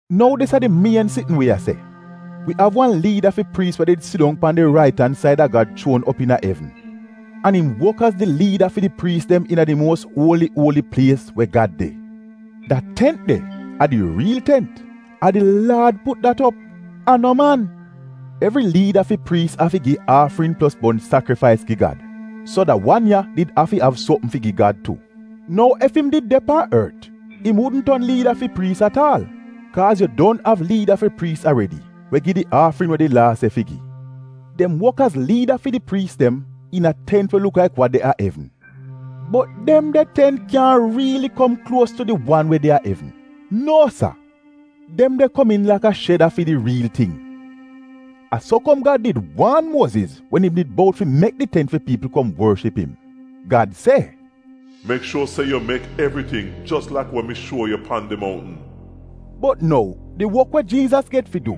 Nou dis a di mien sitn wi a se: Wi av wan liida fi priis we did sidong pan di rait an saida Gad chuon op iina evn. An im wok az di liida fi di priis dem iina di muos uoli uoli plies, we Gad de. Da tent de a di riil tent, a di Laad put dat op — a no man! Evri liida fi priis afi gi aafrin plos bon sakrifais gi Gad. So da wan ya did afi av sopm fi gi Gad tu. Nou, ef im did de pan ort im wudn ton no liida fi priis at aal, kaaz yu don av liida fi priis aredi we gi di aafrin we di laa se fi gi. Dem wok az liida fi di priis dem iina tent we luk laik wa de a evn, bot dem de tent kyaahn riili kom kluos tu di wan we de a evn, nuo sa. Dem de komiin laka sheda fi di riil ting. A so kom Gad did waan Muoziz wen im did bout fi mek di tent fi piipl kom worship im. Gad se, “Mek shuor se yu mek evriting jos laik wa mi shuo yu pan di moutn.” Bot nou, di wok we Jiizas get fi du,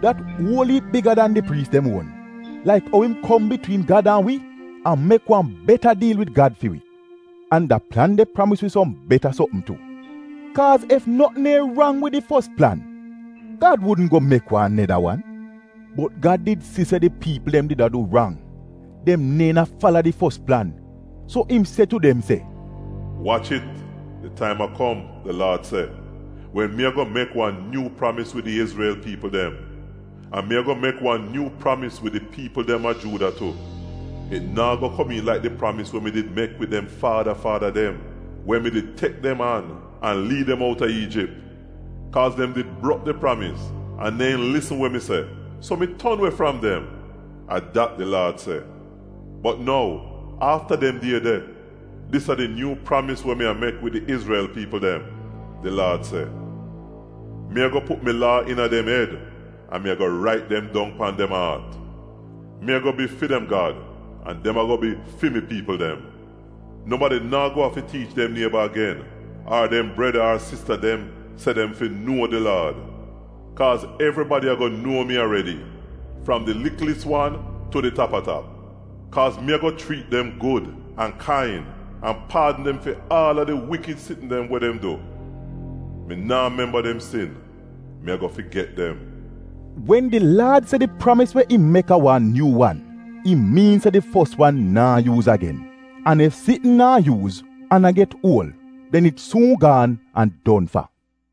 dat uol iip biga dan di priis dem uon, laik ou im kom bitwiin Gad an wi an mek wan beta diil wid Gad fi wi, an da plan de pramis wi som beta sopm tu. Kaaz ef notn neehn rang wid di fos plan, Gad wudn go mek wan neda wan. Bot Gad did si se di piipl dem did a du rang, dem neehn a fala di fos plan, so im se tu dem se, “Wach it, di taim a kom, di Laad se, wen mi ago mek wan nyuu pramis wid di Izrel piipl dem, an mi ago mek wan nyuu pramis wid di piipl dem a Juuda tu. It naa go komiin laik di pramis we mi did mek wid dem faada faada dem wen mi did tek dem an — an liid dem outa Iijip. Kaaz dem did brok di pramis an neehn lisn wa mi se, so mi ton we fram dem. A dat di Laad se, Bot nou, afta dem die de, dis a di nyuu pramis we mi a mek wid di Izrel piipl dem, di Laad se. Mi ago put mi laa dem iina dem ed an mi ago rait dem dong pan dem aat. Mi ago bi fi dem Gad, an dem ago bi fi mi piipl dem. Nobadi naa go afi tiich dem nieba agen, ar dem breda ar sista dem se dem fi, ‘nuo di Laad.’ Kaaz evribadi ago nuo mi aredi, fram di liklis wan tu di tap-a-tap. “Kaaz mi ago chriit dem gud an kain an paadn dem fi aal a di wikid sitn dem we dem du. Mi naa memba dem sin, mi ago figet dem.” Wen di Laad se di pramis we im mek a wan ‘nyuu’ wan, im miin se di fos wan naa yuuz agen. An ef sitn naa yuuz, an a get uol, den it suun gaan an don fa.